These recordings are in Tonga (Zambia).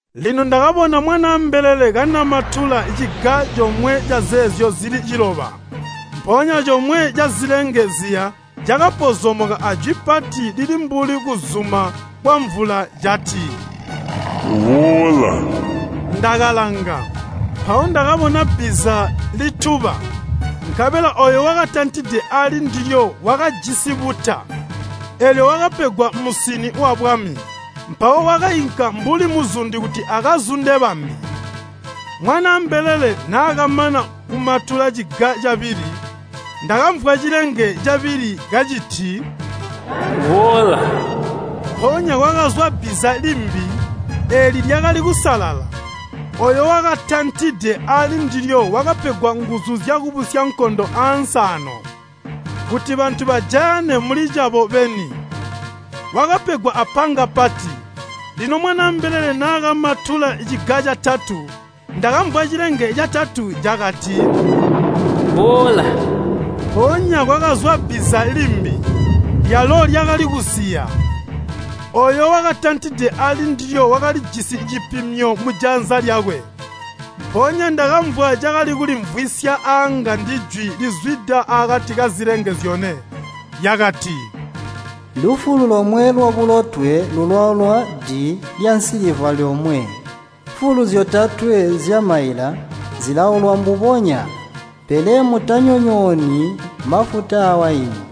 Lino ndakabona Mwanaa mbelele kanamatula ciga comwe cazeezyo zili ciloba, mpoonya comwe cazilenge ziya cakapozomoka ajwi pati lili mbuli kuzuma kwamvula cati, “Boola!” Ndakalanga, mpawo ndakabona bbiza lituba, nkabela ooyo wakatantide ali ndilyo wakajisi buta, eelyo wakapegwa musini wabwami. Mpawo wakainka mbuli muzundi kuti akazunde abambi. Mwanaa mbelele naakamana kumatula ciga cabili, ndakamvwa cilenge cabili kaciti, “Boola!” Mpoonya kwakazwa bbiza limbi, eeli lyakali kusalala. Ooyo wakatantide ali ndilyo wakapegwa nguzu zyakubusya nkondo ansi aano, kuti bantu bajayane muli cabo beni. Wakapegwa apanga pati. Lino Mwanaa mbelele naakamatula ciga catatu, ndakamvwa cilenge catatu cakati, “Boola!” Mpoonya kwakazwa bbiza limbi, lyalo lyakali kusiya. Ooyo wakatantide ali ndilyo wakalijisi cipimyo mujanza lyakwe. Mpoonya ndakamvwa cakali kulimvwisya aanga ndijwi lizwida akati kazilenge zyone, lyakati, “Lufulu lomwe lwabulotwe lulaulwa di lyansiliva lyomwe, mfulu zyotatwe zyamaila zilaulwa mbubonya, pele mutanyonyooni mafuta awaini.”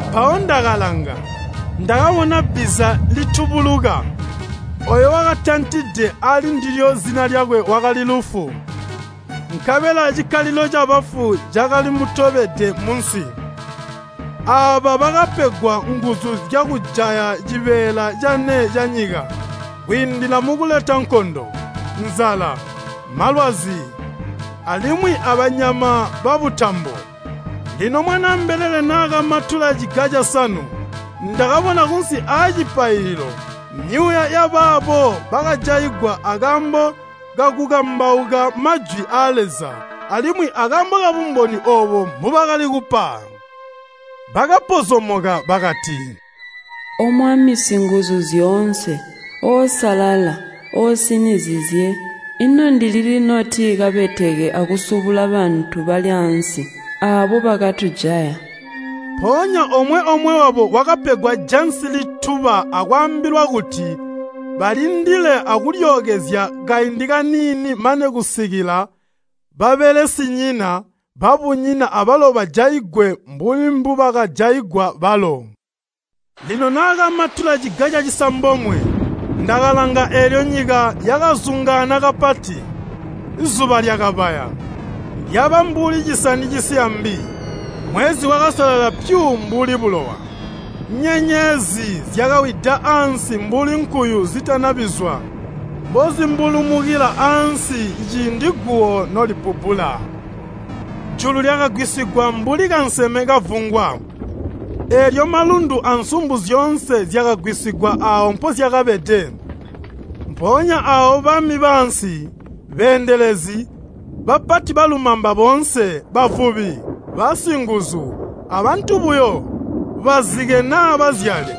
Mpawo ndakalanga, ndakabona bbiza litubuluka. Ooyo wakatantide ali ndilyo zina lyakwe wakali Lufu, nkabela cikkalilo cabafu cakali mutobede munsi. Aaba bakapegwa nguzu zyakujaya cibeela cane canyika kwiindila mukuleta nkondo, nzala, malwazi, alimwi abanyama babutambo. Lino Mwanaa mbelele naakamatula ciga casanu, ndakabona kunsi aacipaililo myuuya yabaabo bakajaigwa akaambo kakukambauka majwi aa Leza alimwi akaambo kabumboni oobo mbubakali kupa. Bakapozomoka bakati, “O Mwami Singuzuzyoonse, Oosalala, Oosinizizye, ino ndilili noti kabeteke akusubula bantu bali ansi aabo bakatujaya?” Mpoonya omwe-omwe wabo wakapegwa jansi lituba akaambilwa kuti balindile akulyookezya kaindi kaniini mane kusikila babelesinyina, babunyina abalo bajaigwe mbuli mbubakajaigwa balo. Lino naakamatula ciga cacisambomwe, ndakalanga eelyo nyika yakazungaana kapati. Zuba lyakabaya, lyaba mbuli cisani cisiya mbi, mwezi wakasalala pyu mbuli bulowa. Nyenyezi zyakawida ansi mbuli nkuyu zitana bizwa mbozi mbulumukila ansi ciindi guwo nolibbubbula. Julu lyakagwisigwa mbuli kanseme kavungwa, eelyo malundu ansumbu zyoonse zyakagwisigwa aawo mpozyakabede. Mpoonya aawo bami baansi, beendelezi, bapati balumamba boonse, bavubi, basinguzu, abantu buyo, bazike naa bazyale,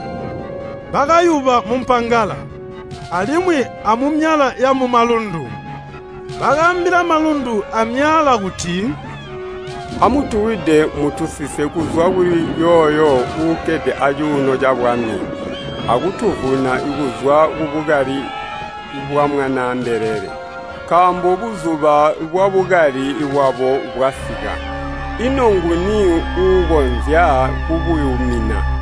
bakayuba mumpangala, alimwi amumyaala yamumalundu. Bakaambila malundu aamyaala kuti, “Amutuwide mutusise kuzwa kuli yooyo uukkede acuuno cabwami akutuvuna kuzwa kubukali bwa Mwanaa mbelele! Nkaambo buzuba bwabukali bwabo bwasika, ino nguni uukonzya kubuyumina?”